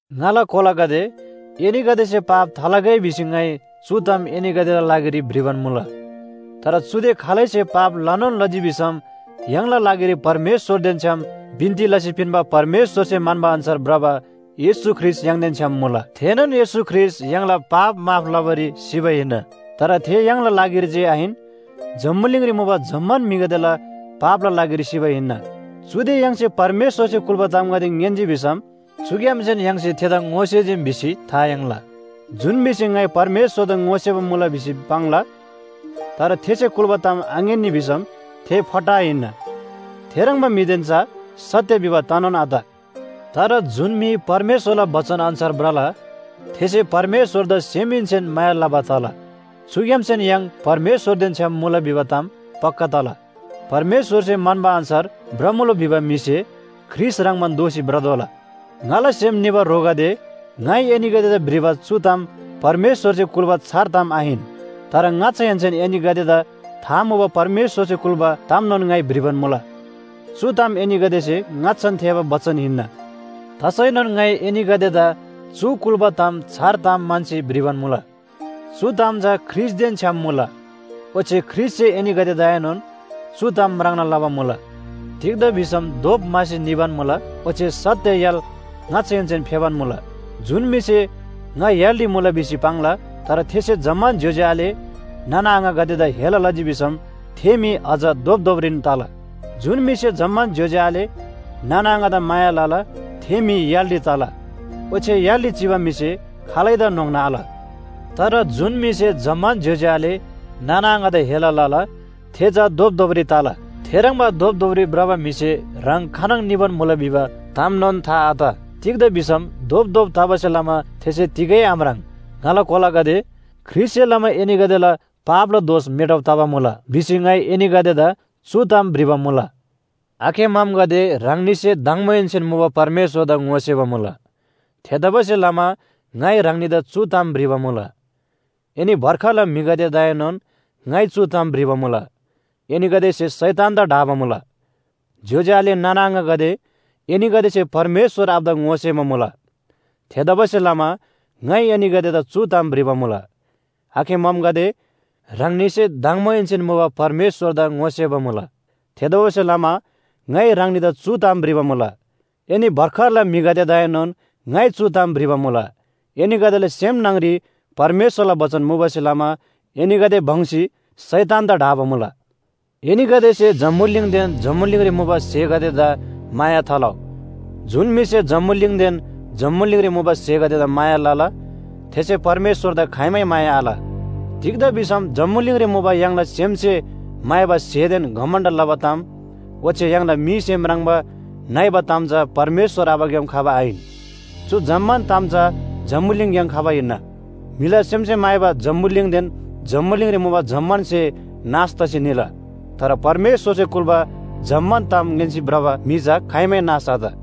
ङाला कोलागदे, एनीगदेसे पाप थालगै भिसी ङाइ चु ताम एनीगदेला लागिरी भ्रिबान मुला। तर चुदे खालैसे पाप लनोन लजी भिसम य्‍हाङला लागिरी परमेश्‍वरदेन छ्‌याम बिन्‍ती लसी पिन्‍बा परमेश्‍वरसे म्‍हन्‍बा अन्‍छार भ्रबा येशू ख्रीष्‍ट य्‍हाङदेन छ्‌याम मुला। थेनोन येशू ख्रीष्‍ट य्‍हाङला पाप माफ लबारी सिबा हिन्‍ना। तर थे य्‍हाङला लागिरी जे आहिन जम्‍बुलिङरी मुबा जम्‍मान म्‍हिगदेला पापला लागिरी सिबा हिन्‍ना। चुदे य्‍हाङसे परमेश्‍वरसे कुल्‍बा तामगदे ङ्‌यान्‍जी भिसम चुग्‍यामसेन य्‍हाङसे थेदा ङोसेजीम भिसी था याङ्ला। जुन म्‍हिसे ङाइ परमेश्‍वरदा ङोसेबा मुला भिसी पाङ्ला, तर थेसे कुल्‍बा ताम आङ्‌यान्‍नी भिसम थे फट्टा हिन्‍ना। थेह्रङ्बा म्‍हिदेन चा सत्‍य भिबा तनोन आत। तर जुन म्‍हि परमेश्‍वरला बचन अन्‍छार भ्रला, थेसे परमेश्‍वरदा सेमहेन्‍सेन माया लबा तला। चुग्‍यामसेन य्‍हाङ परमेश्‍वरदेन छ्‌याम मुला भिबा ताम पक्‍का तला। परमेश्‍वरसे म्‍हन्‍बा अन्‍छार भ्रमुला भिबा म्‍हिसे ख्रीष्‍ट ह्रङ्‌बान दोःसी भ्रतोःला। ङाला सेम निबा ह्रोगदे, ङाइ एनीगदेदा भ्रिबा चु ताम परमेश्‍वरसे कुल्‍बा छार ताम आहिन। तर ङाच्‍छाहेन्‍सेन एनीगदेदा था मुबा परमेश्‍वरसे कुल्‍बा तामनोन ङाइ भ्रिबान मुला। चु ताम एनीगदेसे ङाच्‍छान थेःबा बचन हिन्‍ना। तसैनोन ङाइ एनीगदेदा चु कुल्‍बा तामदा छार ताम म्‍हन्‍सी भ्रिबान मुला। चु ताम चा ख्रीष्‍टदेन छ्‌याम मुला, ओच्‍छे ख्रीष्‍टसे एनीगदेदाएनोन चु ताम म्राङ्ना लबा मुला। तिग्‍दा भिसम धोप म्‍हासी निबान मुला, ओच्‍छे सत्‍य य्‍हाल ङाच्‍छाहेन्‍सेन फेबान मुला। जुन म्‍हिसे ङा य्‍हालरी मुला भिसी पाङ्ला, तर थेसे जम्‍मान ज्‍योज्‍यो आले नाना आङागदेदा हेला लजी भिसम थे म्‍हि अझ धोपधोपरीन तला। जुन म्‍हिसे जम्‍मान ज्‍योज्‍यो आले नाना आङादा माया लला थे म्‍हि य्‍हालरी तला, ओच्‍छे य्‍हालरी चिबा म्‍हिसे खालैदा न्‍होङ्ना आल। तर जुन म्‍हिसे जम्‍मान ज्‍योज्‍यो आले नाना आङादा हेला लला, थे चा धोपधोपरी तला। थेह्रङ्बा धोपधोपरी भ्रबा म्‍हिसे ह्राङ खानङ निबान मुला भिबा तामनोन था आत। तिग्‍दा भिसम धोपधोप तबासे लमा थेसे तिगै आम्राङ्। ङाला कोलागदे, ख्रीष्‍टसे लमा एनीगदेला पापला दोष मेटब तबा मुला भिसी ङाइ एनीगदेदा चु ताम भ्रिबा मुला। आखे ममगदे, ह्राङनीसे दङबोहेन्‍सेन मुबा परमेश्‍वरदा ङोसेबा मुला। थेतबासेलमा ङाइ ह्राङनीदा चु ताम भ्रिबा मुला। एनी भर्खरला म्‍हिगदेदाएनोन ङाइ चु ताम भ्रिबा मुला, एनीगदेसे शैतानदा ढाबा मुला। ज्‍योज्‍यो आले नाना आङागदे, एनीगदेसे परमेश्‍वर आबादा ङोसेबा मुला। थेतबासेलमा ङाइ एनीगदेदा चु ताम भ्रिबा मुला। आखे ममगदे, ह्राङनीसे दङबोहेन्‍सेन मुबा परमेश्‍वरदा ङोसेबा मुला। थेतबासेलमा ङाइ ह्राङनीदा चु ताम भ्रिबा मुला। एनी भर्खरला म्‍हिगदेदाएनोन ङाइ चु ताम भ्रिबा मुला, एनीगदेला सेम न्‍हङरी परमेश्‍वरला बचन मुबासे लमा एनीगदे भङ्‍सी शैतानदा ढाबा मुला। एनीगदेसे जम्‍बुलिङदेन जम्‍बुलिङरी मुबा स्‍हेगदेदा माया थालउ। जुन म्‍हिसे जम्‍बुलिङदेन जम्‍बुलिङरी मुबा स्‍हेगदेदा माया लला, थेसे परमेश्‍वरदा खाइमै माया आल। तिग्‍दा भिसम जम्‍बुलिङरी मुबा य्‍हाङला सेमसे म्‍हाइबा स्‍हेदेन घमण्‍ड लबा ताम ओच्‍छे य्‍हाङला मीसे म्राङ्बा नइबा ताम चा परमेश्‍वर आबाग्‍याम खबा आहिन। चु जम्‍मान ताम चा जम्‍बुलिङग्‍याम खबा हिन्‍ना। म्‍हिला सेमसे म्‍हाइबा जम्‍बुलिङदेन जम्‍बुलिङरी मुबा जम्‍मान स्‍हे नाश तसी निला, तर परमेश्‍वरसे कुल्‍बा जम्‍मान ताम ङ्‌यान्‍सी भ्रबा म्‍हि चा खाइमै नाश आत।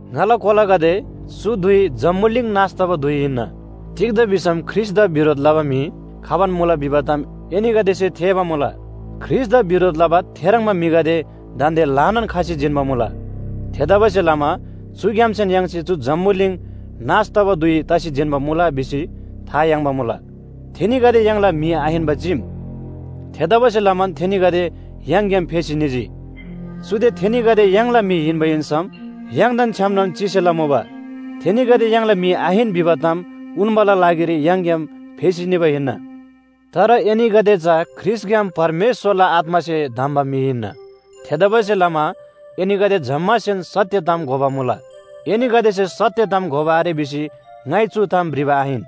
ङाला कोलागदे, चु धुइ जम्‍बुलिङ नाश तबा धुइ हिन्‍ना। तिग्‍दा भिसम ख्रीष्‍टदा बिरोध लबा म्‍हि खबान मुला भिबा ताम एनीगदेसे थेःबा मुला। ख्रीष्‍टदा बिरोध लबा थेह्रङ्बा म्‍हिगदे दान्‍दे ल्‍हानान खसी जिन्‍बा मुला। थेतबासेलमा चुग्‍यामसेन य्‍हाङसे चु जम्‍बुलिङ नाश तबा धुइ तसी जिन्‍बा मुला भिसी था याङ्बा मुला। थेनीगदे य्‍हाङला म्‍हि आहिन्‍बा चीम। थेतबासेलमान थेनीगदे य्‍हाङग्‍याम फेसी निजी। चुदे थेनीगदे य्‍हाङला म्‍हि हिन्‍बा हिन्‍सम य्‍हाङदेन छ्‌यामनोन चिसेला मुबा। थेनीगदे य्‍हाङला म्‍हि आहिन भिबा ताम उन्‍बाला लागिरी य्‍हाङग्‍याम फेसी निबा हिन्‍ना। तर एनीगदे चा ख्रीष्‍टग्‍याम परमेश्‍वरला आत्‍मासे धम्‍बा म्‍हि हिन्‍ना। थेतबासेलमा एनीगदे जम्‍मासेन सत्‍य ताम घोबा मुला। एनीगदेसे सत्‍य ताम घोबा आरे भिसी ङाइ चु ताम भ्रिबा आहिन।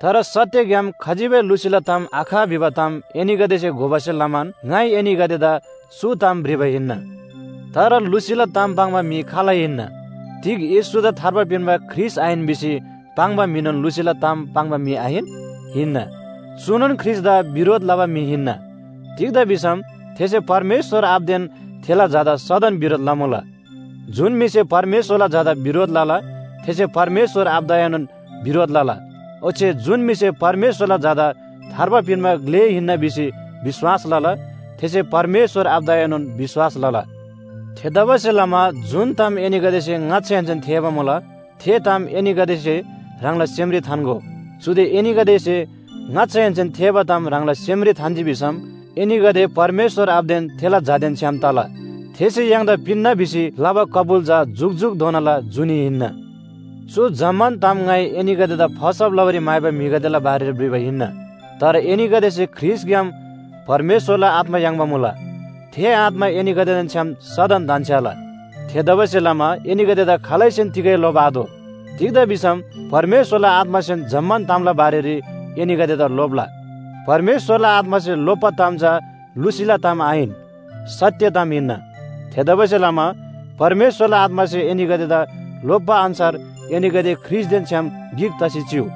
तर सत्‍यग्‍याम खजिबै लुसीला ताम आख भिबा ताम एनीगदेसे घोबासे लमान ङाइ एनीगदेदा चु ताम भ्रिबा हिन्‍ना। तर लुसीला ताम पाङ्बा म्‍हि खाल हिन्‍ना? तिग येशूदा थार्बा पिन्‍बा ख्रीष्‍ट आहिन भिसी पाङ्बा म्‍हिनोन लुसीला ताम पाङ्बा म्‍हि आहिन? हिन्‍ना। चुनोन ख्रीष्‍टदा बिरोध लबा म्‍हि हिन्‍ना। तिग्‍दा भिसम थेसे परमेश्‍वर आबादेन थेला झादा सदन बिरोध लमुला। जुन म्‍हिसे परमेश्‍वरला झादा बिरोध लला थेसे परमेश्‍वर आबादाएनोन बिरोध लला। ओच्‍छे जुन म्‍हिसे परमेश्‍वरला झादा थार्बा पिन्‍बा ग्‍ले हिन्‍ना भिसी विश्‍वास लला थेसे परमेश्‍वर आबादाएनोन विश्‍वास लला। थेतबासेलमा जुन ताम एनीगदेसे ङाच्‍छाहेन्‍सेन थेःबा मुला, थे ताम एनीगदेसे ह्राङला सेमरी थान्‍गो। चुदे एनीगदेसे ङाच्‍छाहेन्‍सेन थेःबा ताम ह्राङला सेमरी थान्‍जी भिसम एनीगदे परमेश्‍वर आबादेन थेला झादेन छ्‌याम तला। थेसे य्‍हाङदा पिन्‍ना भिसी लबा कबुल चा जुकजुकधोनाला जुनी हिन्‍ना। चु जम्‍मान ताम ङाइ एनीगदेदा फसब लबारी म्‍हाइबा म्‍हिगदेला बारेरी भ्रिबा हिन्‍ना। तर एनीगदेसे ख्रीष्‍टग्‍याम परमेश्‍वरला आत्‍मा याङ्बा मुला, थे आत्‍मा एनीगदेदेन छ्‌याम सदन धन्‍छ्‌याला। थेतबासेलमा एनीगदेदा खालैसेन तिगै लोप्‍आतोः। तिग्‍दा भिसम परमेश्‍वरला आत्‍मासेन जम्‍मान तामला बारेरी एनीगदेदा लोप्‍ला। परमेश्‍वरला आत्‍मासे लोप्‍बा ताम चा लुसीला ताम आहिन, सत्‍य ताम हिन्‍ना। थेतबासेलमा परमेश्‍वरला आत्‍मासे एनीगदेदा लोप्‍बा अन्‍छार एनीगदे ख्रीष्‍टदेन छ्‌याम गिक तसी चिउ।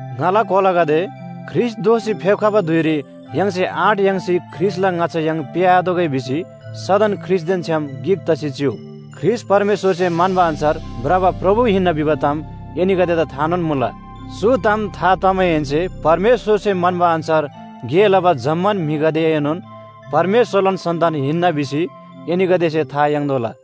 ङाला कोलागदे, ख्रीष्‍ट दोःसी फेप्‍खबा धुइरी य्‍हाङसे आँट याङ्सी ख्रीष्‍टला ङाच्‍छा य्‍हाङ पेःआतोःगै भिसी सदन ख्रीष्‍टदेन छ्‌याम गिक तसी चिउ। ख्रीष्‍ट परमेश्‍वरसे म्‍हन्‍बा अन्‍छार भ्रबा प्रभु हिन्‍ना भिबा ताम एनीगदेदा थानोन मुला। चु ताम था तमाहेन्‍से परमेश्‍वरसे म्‍हन्‍बा अन्‍छार गे लबा जम्‍मान म्‍हिगदेएनोन परमेश्‍वरलान सन्‍तान हिन्‍ना भिसी एनीगदेसे था याङ्‌तोःला।